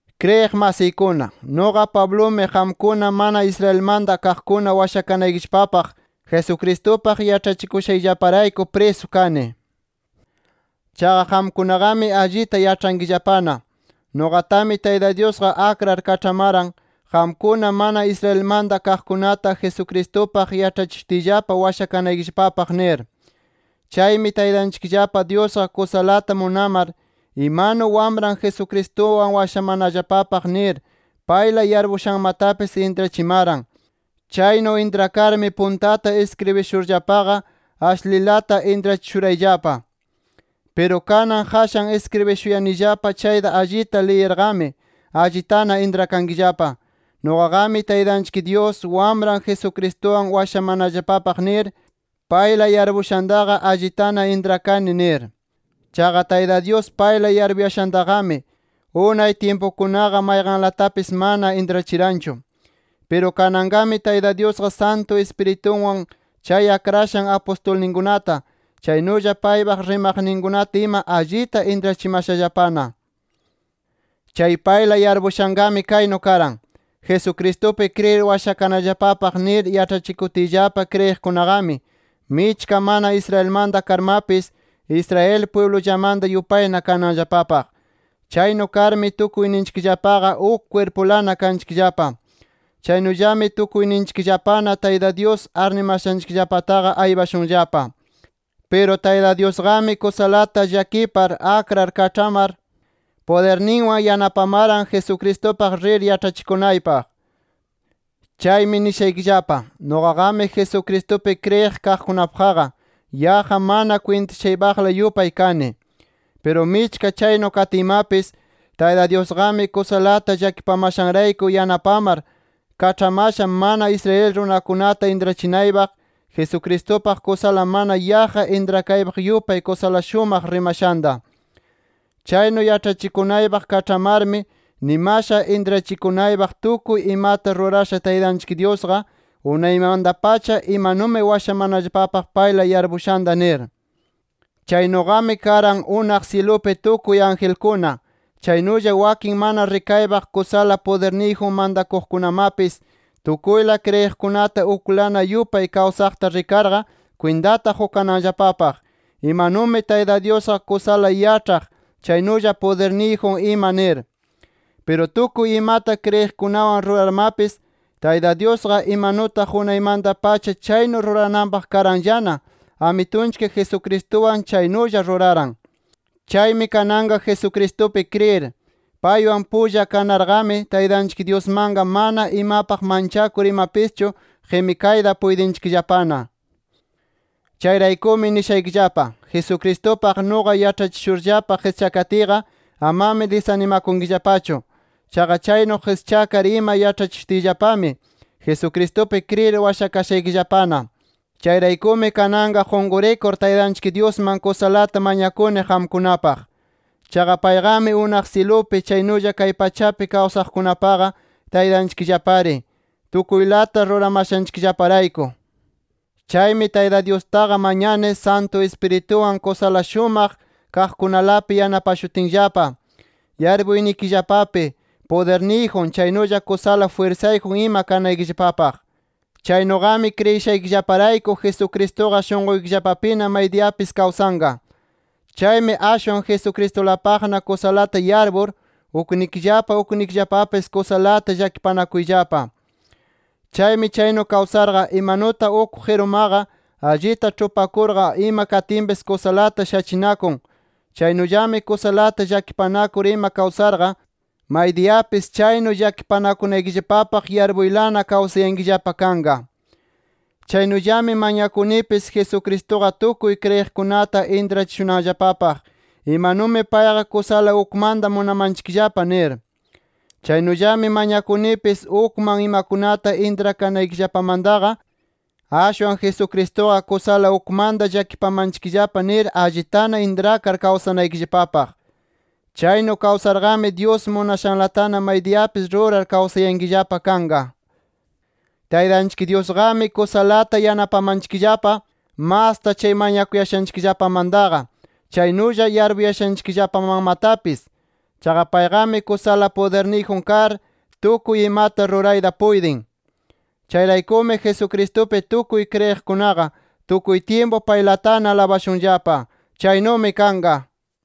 Kriyiq masiykuna, nuqa Pablumi qamkuna mana Israelmanta kaqkuna washakanaykillapapaq Jesucristupaq yaĉhachikushayllaparayku prisu kani. Chaqa qamkunaqami allita yaĉhankillapana, nuqatami Tayta Dyusqa akrar kaĉhamaran, qamkuna mana Israelmanta kaqkunata Jesucristupaq yaĉhachishutiyllapa washakanaykillapapaq nir. Chaymi Taytanchikllapa Dyusqa kusalata munamar, imanu Wamran Jesucristuwan washamanallapapaq nir payla yarpuyashanmatapis intrachimaran. Chaynu intrakarmi puntata iskribishurllapaqa ashlilata intrachishurayllapa. Piru kanan qashan iskribishuyanillapa chayta allita liyirqami allitana intrakankillapa, nuqaqami Taytanchik Dyus, Wamran Jesucristuwan washamanallapapaq nir payla yarpushantaqa allitana intrakani nir. Chaqa Tayta Dyus payla yarpuyashantaqami, unay tyimpukunaqa mayqanlatapis mana intrachiranchu. Piru kananqami, Tayta Dyusqa Santu Ispiritunwan chay akrashan apustulninkunata, chaynulla paypaq rimaqninkunata ima allita intrachimashallapana. Chay payla yarpushanqami kaynu karan: Jesucristupi kriyir washakananllapapaq nir yaĉhachikutiyllapa kriyiqkunaqami, michka mana Israelmanta karmapis, Israel pwiblullamanta yupayna kananllapapaq. Chaynu karmi tukuyninchikllapaqa, uk kwirpulana kanchikllapa. Chaynullami tukuyninchikllapana Tayta Dyus arnimashanchikllapataqa aypashunllapa. Piru Tayta Dyusqami kusalata llakipar, akrar kaĉhamar pudirninwan yanapamaran Jesucristupaq rir yaĉhachikunaypaq. Chaymi nishaykillapa: Nuqaqami Jesucristupi kriyiq kaqkunapaqqa yaqqa mana kwintachaypaqla yupay kani. Piru michka chaynu katiymapis, Tayta Dyusqami kusalata llakipamashanrayku yanapamar kaĉhamasha mana Israel runakunata intrachinaypaq, Jesucristupaq kusala mana yaqqa intrakaypaq yupay kusala shumaq rimashanta. Chaynu yaĉhachikunaypaq kaĉhamarmi nimasha intrachikunaypaq, tukuy imata rurasha Taytanchik Dyusqa unaymanta-pacha imanumi washamanallapapaq payla yarpushanta nir. Chaynuqami karan, unaq syilupi tukuy angelkuna, chaynulla wakin mana rikaypaq kusala pudirniyjun mantakuqkunamapis, tukuyla kriyiqkunata uklana yupay kawsaqta rikarqa kwintata qukananllapapaq, imanumi Tayta Dyusqa kusala yaĉhaq chaynulla pudirniyjun ima nir. Piru tukuy imata kriyiqkunawan rurarmapis Tayta Dyusqa imanutaq unaymanta-pacha chaynu rurananpaq karanllana Amitunchik Jesucristuwan chaynulla ruraran. Chaymi kananqa Jesucristupi kriyir, paywan pulla karnaqami, Taytanchik Dyusmanqa mana imapaq manchakur imapischu qimikayta puytinchikllapana. Chayraykumi nishaykillapa: Jesucristupaq nuqa yaĉhachishurllapa qischakatiyqa, amami disanimakunkillapachu. Chaqa chaynu qischakar ima yaĉhachishutiyllapami, Jesucristupi kriyir washakashaykillapana. Chayraykumi kananqa qunqurikur Taytanchik Dyusman kusalata mañakuni qamkunapaq. Chaqa payqami unaq syilupi chaynulla kay pachapi kawsaqkunapaqa Taytanchikllapari, tukuylata ruramashanchikllaparayku. Chaymi Tayta Dyustaqa mañani Santu Ispiritunwan kusala shumaq kaqkunalapi yanapashutinllapa, yarpuynikillapapi pudirniyjun, chaynulla kusala jwirsayjun ima kanaykillapapaq. Chaynuqami kriyishaykillaparayku, Jesucristuqa shunquykillapapina maydiyapis kawsanqa. Chaymi ashwan Jesucristulapaqna kusalata yarpur, uknikillapa uknikillapapis kusalata llakipanakunkillapa. Chaymi chaynu kawsarqa, imanutaq uk qirumaqa allita ĉhupakurqa ima katinpis kusalata shachinakun, chaynullami kusalata llakipanakur ima kawsarqa maydiyapis chaynu llakipanakunaykillapapaq yarpurlana kawsayankillapa kanqa. Chaynullami mañakunipis Jesucristuqa tukuy kriyiqkunata intrachishunanllapapaq, imanumi payqa kusala ukmanta munamanchikllapa nir. Chaynullami mañakunipis ukman imakunata intrakanaykillapamantaqa, ashwan Jesucristuqa kusala ukmanta llakipamanchikllapa nir allitana intrakar kawsanaykillapapaq. Chaynu kawsarqami, Dyus munashanlatana maydiyapis rurar kawsayankillapa kanqa. Taytanchik Dyusqami kusalata yanapamanchikllapa, masta chay mañashanchikllapamantaqa, chaynulla yarpushanchikllapamanmatapis. Chaqa payqami kusala pudirniyjun kar, tukuy imata rurayta puytin. Chayraykumi Jesucristupi tukuy kriyiqkunaqa tukuy tyimpu paylatana alabashunllapa. ¡Chaynumi kanqa!